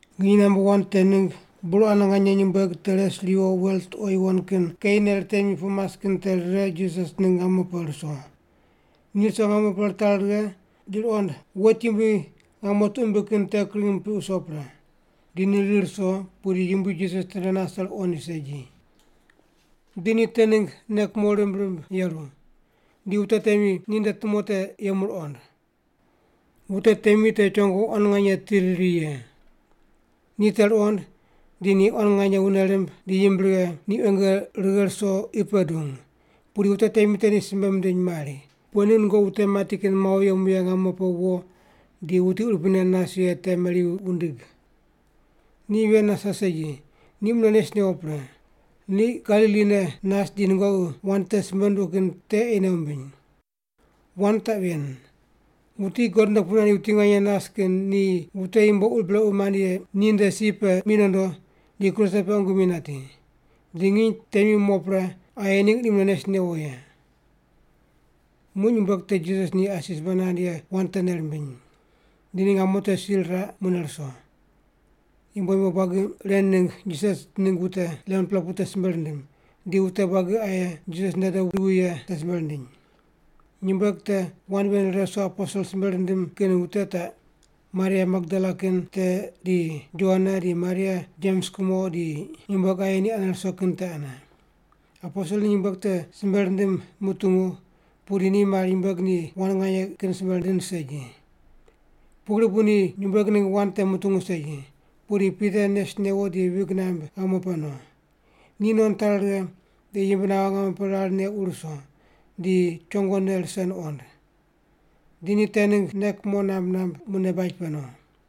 Nginy namba wan te ningg burane nganye nyumbueg te res ruyo wel tuqo yuwon kin keine ritemi pu mas kin te rire Jisas ningg ngamo pe ruso. Ni ruso ngamo pe ritari righe, di ruqond wet yumbui ngamo tuq mimbiq kin te kring mipiq wuso pre. Di ni rir ruso, pudi Yumbui Jisas tende nase ruqoind segi. Di ni te ningg nei kumo rimb rimb yeru. Di wute temi ninde tumo te yemu ruqond. Wute temi te chongo quan nganye ti riri ye. Ni te ruqond, di ni quan nganye wune rimb di yimb righe ni quenge righe ruso qi pe dung. Pudi wute temi te ni simbe mindiny mari, “Pughe ningg nungoqi wute mati kin mawo yemu ye ngamo pe wo di wuti urupui ne nas ye te meri wundig? Ni ven nase segi, ni mune nes newo pre. Ni Galili ne nas di nungoqi wand te simbe nunduq kin te ei nei wumbiny. Wand taq ven, ‘Wuti God nde pu nandi wuti nganye nas kin ni wute yumbo ur brequ mand ye ninde si pe mi nondo di kruse pe qungu mi nati. Di nginy temi mo pre aye ningg ni mune nes newo ye’.” Muq nyumbueg te Jisas ni asi simbe nand ye wand te nei rimbiny. Di ni ngamo te si riraq mune ruso, yumbo yumbo buagi ren ningg Jisas ningg wute 11-pela te simbe rindim, di wute buagi aye Jisas nde dobu ruwi ye te simbe rindiny. Nyumbueg te wand ven rire ruso aposel simbe rindim kin wute taq, Maria Magdala kin te di Joana di Maria Jems kumo, di nyumbueg aye ni ane ruso kin te ane. Aposel ni nyumbueg te simbe rindim mutungu, pudi ni mari nyumbueg ni wand nganye kin simbe rind segi. Pugri bu ni nyumbueg ningg wand te mutungu segi. Pudi Pita nes newo di vig namb ngamo pe no. Ni no nitari righe, di yimb naghe ngamo pe rar neq wur wuso, di chongone rise nuqond. Di ni te ningg nei kumo namb namb mune baj pe no.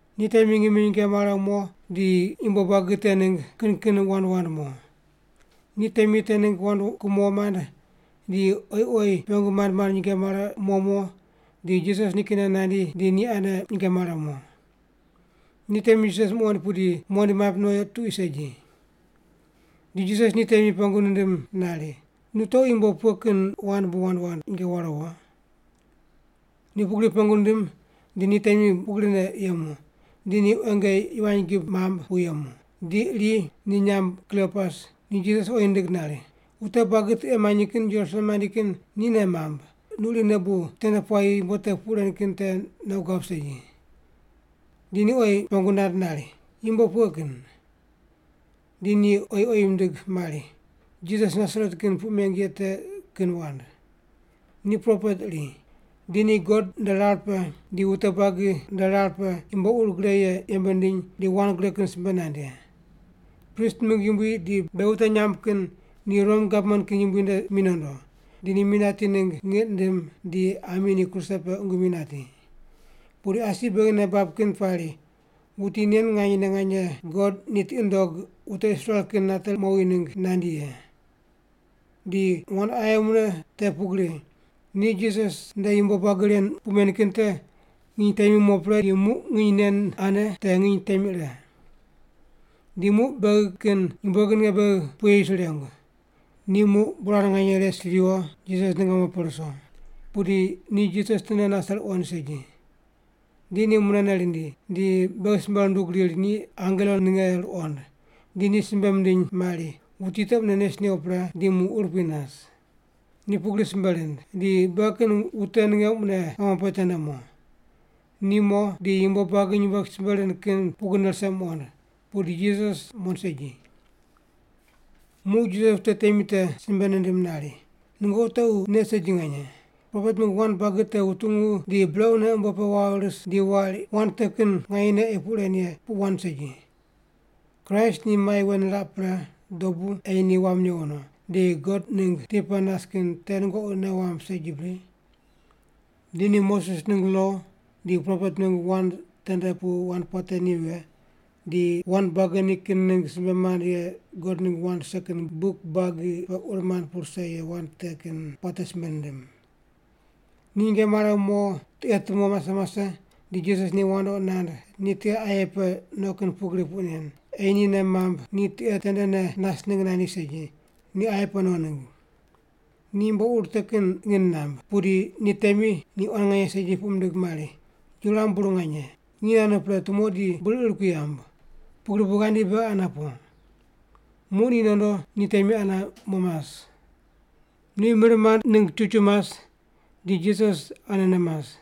Ni temi ngimi nyinge mare mo di yumbo buagi te ningg kin kin wand wand mo. Ni temi te ningg wand kumo mand di oyi oyi pengu mand mand nyinge mare mo mo di Jisas nikinne nandi di ni ane nyinge mare mo. Ni temi Jisas muqoind pudi muqoind maip no tuqui segi. Di Jisas ni temi pengu nindim nari, “Nu tequ yumbo pughe kin wand bu wand wand nyinge ware wo?” Ni pugri pengu nindim di ni temi pugrine yemu, di ni quenge yivany gib mamb pu yemu. Di iri, ni nyamb Kliopas, ni Jisas oyi nindig nari, “Wute buagi tiqe manyi kin Jerusalem mandi kin ni nei mamb, nu irine bu tende puayi yumbo te puq ren kin te nei guab segi.” Di ni oyi pengu nand nari, “Yumbo pughe kin?” Di ni oyi oyi mindig mari, “Jisas Nasaret kin puq meng ye te kin wand. Ni propet iri. Di ni God nde rar pe di wute buagi nde rar pe yumbo ur gre ye yembe nindiny di wand gre kin simbe nand ye. Prist mingg yumbui di beghi wute nyamb kin ni Rom gavman kin yumbui nde mi nondo, di ni mi nati ningg ngiq nindim, di ami ni kruse pe qungu mi nati. Pudi asi beghi nei bab kin pari wuti nen nganyene nganye God ni tiqi nundog wute Israel kin nate mowi ningg nandi ye. Di wand aye mune te pugri. Ni Jisas nde yumbo buagi ren puq men kin te nginy temi mo pre di muq nginy nen ane te nginy temi ire. Di muq beghi kin nyumbueg ninge beghi puye yis rirengu. Ni muq burane nganye res ruyo, Jisas ningg ngamo pe ruso, pudi ni Jisas tende nase ruqoind segi. Di ni munene rindi, di beghi simbe rundug riri ni angelo ninge ruqond, di ni simbe mindiny mari wuti te mune nes newo pre, di muq urupui nas. Ni pugri simbe rind, di beghi kin wute ninge mune ngamo pe tende mo. Ni mo, di yumbo buagi nyumbueg simbe rind kin pugrine rise muqond, pudi Jisas muqoind segi.” Muq Jisas wute temi te simbe nindim nari, “Nungoqi tequ nei segi nganye. Propet mingg wand buagi te wutungu di brequne umbo pe wawo ris di wari wand te kin nganyene ei puq ren ye puq wand segi. Kraist ni mai wen niraq pre dobu ei ni wam newo no, di God ningg ti pe nas kin te nungoqi nei wamb segi bri?” Di ni Moses ningg lo di propet mingg wand tende pu wand puate ni vighe, di wand buagi nikin ningg simbe mand ye God ningg wand rise kin buk buagi pe ur mand pu rise ye wand te kin puate simbe nindim. Ni nyinge mare mo tiqe tumo mase mase di Jisas ni wandoqi nand ni tiqe aye pe no kin pugri puq nen, ei ni nei mamb ni tiqe tendene nas ningg nandi segi, ni aye pe no ningg. Ni yumbo ur te kin ngin namb, pudi ni temi ni quan nganye segi puq mindig mari, “Yuram bur nganye, nginy naghe no pre tumo di bur ir kui yamb, pugri bu ghandi beghi ane po.” Muq ni nondo, ni temi ane mo mas. Ni mir mand ningg chuchu mas, di Jisas anene mas.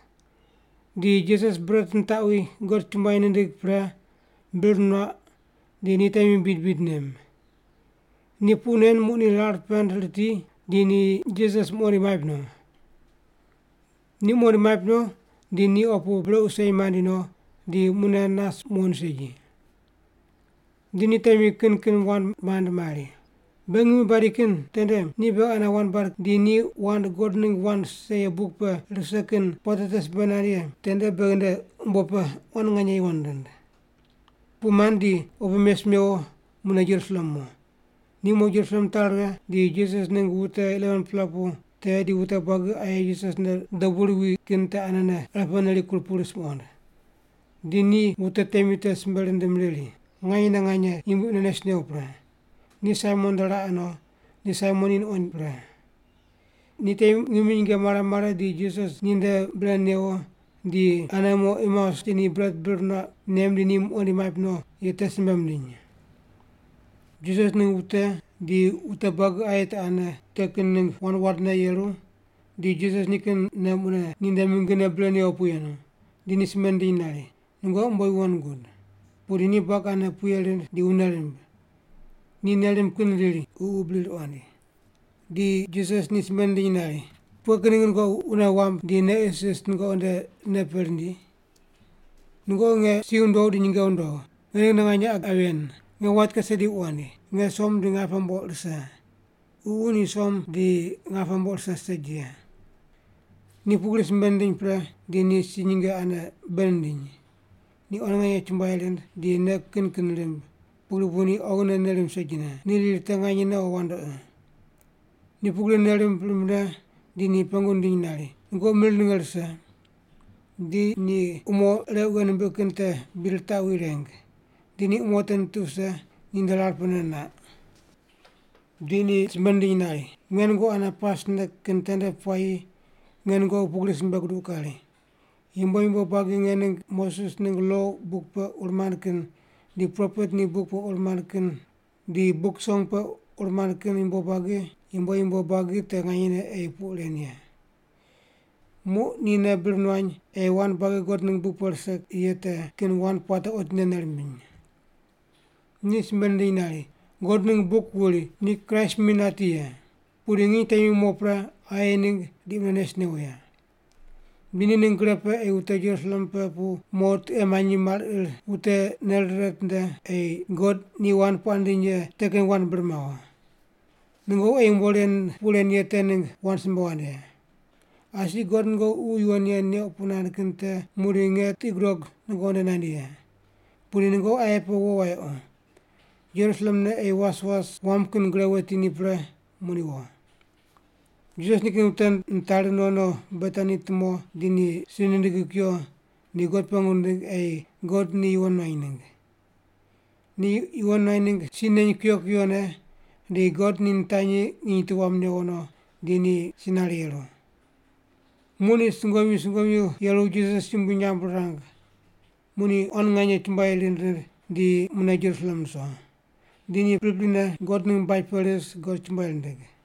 Di Jisas bret nitaqwi, God chumbuai nindig pre, bir nuaq, di ni temi bid bid nem. Ni puq nen muq ni rar pend riti, di ni Jisas muqoind maip no. Ni muqoind maip no, di ni opu brequ sei maind no di mune nas muqoind segi. Di ni temi kin kin wand mand mari, “Beghi ngimi badi kin tende ni beghi ane wand bad di ni wand God ningg wand rise ye buk pe rise kin puate te simbe nand ye tende beghi nde umbo pe quan nganye yuwon rind.” Puq mand di opu mes mewo mune Jerusalem mo. Mo Jerusalem mitari righe, di Jisas ningg wute 11-pela pu te di wute buagi aye Jisas nde dobu ruwi kin te ane irepene rikur pu ris muqond. Di ni wute temi te simbe rindim riri, “Nganyene nganye! Yumbui mune nes newo pre. Ni Saimon nde raqe no, di Saimon ni nuqoind pre.” Di ni temi mune ngimi nyinge mare mare di Jisas ninde bre newo, di ane mo Emeus mas di ni bret bir nuaq nem di ni muqoind maip no ye te simbe mindiny. Jisas ningg wute di wute buagi aye te ane te kin ningg wand wandne yeru di Jisas nikinne mune ninde mingine bre newo pu yenu, di ni simbe nindiny nari, “Nungoqi umbo yuwon gud.” Pudi ni buagi ane puye rind di wune rimb. Ni nei rimb kin riri ni ququ bri ruqoind. Di Jisas ni simbe nindiny nari, “Pughe kin ningg nungoqi wune wamb di nei isis nungoqi nde nei pe rindi? Nungoqi nge si wundogh di nyinge wundogh. Nge ningne nganye qa ven. Nge wait kase di wuqoind, nge som di ngape mboq rise. Ququ ni som di ngape mboq rise segi ye.” Ni pugri simbe nindiny pre di ni si nyinge ane bei nindiny. Ni quan nganye chumbuai rind, di nei kin kin rimb, pugri bu ni oghine nei rimb segine. Ni riri te nganye o wandoqi. Ni pugri nei rimb rimbne di ni pengu nindiny nari, “Nungoqi mir ninge rise?” Di ni umo req wughe nimbiq kin te bid ritaqwi reng. Di umo te nitiq wuse ninde rar pene naq. Di ni simbe nindiny nari, “Nge nungoqi ane pasne kin tende puayi nge nungoqi pugri simbe guduq kari, ‘Yumbo yumbo buagi nge ningg Moses ningg lo buk pe ur mand kin di propet ni buk pe ur mand kin di Buk Song pe ur mand kin yumbo yumbo buagi te nganyene ei puq ren ye’.” Muq ni nei bir nuany ei wand buagi God ningg buk pe rise ye te kin wand puate otinde nei rimbiny. Ni simbe nindiny nari, “God ningg buk wuri ni Kraist mi nati ye. Pudi nginy temi mo pre, aye ningg di mune nes newo ye. Di ni ningg gre pe ei wute Jerusalem pe pu mo tiqe manyi mar ir wute nei rire ritinde ei God ni wand puaq nindiny ye te kin wand bir mawo. Nungoqi ei yumbo ren puq ren ye te ningg wand simbe wand ye. Asi God nungoqi Ququ Yuwon Ye neuq puq nand kin te muqdi nge tiqi gudog nungoqi nde nandi ye. Pudi nungoqi aye pe wo wayequ, Jerusalem ne ei was was wam kin gre weti ni pre muqdi wo.” Jisas nikin wute nitari no no Betani tumo di ni si nindigi kuyo di God pengu nindig ei God ni yuwon nuany ningg. Ni yuwon nuany ningg si neny kuyo kuyone di God ni nitanyi nginy tu wam newo no, di ni si nare yeru. Muq ni sungomyu sungomyu yeru Jisas yumbui nyamb rirang. Muq ni quan nganye chumbuai rind rind di mune Jerusalem ruso. Di ni priprine God ningg baj pe ris God chumbuai rindig.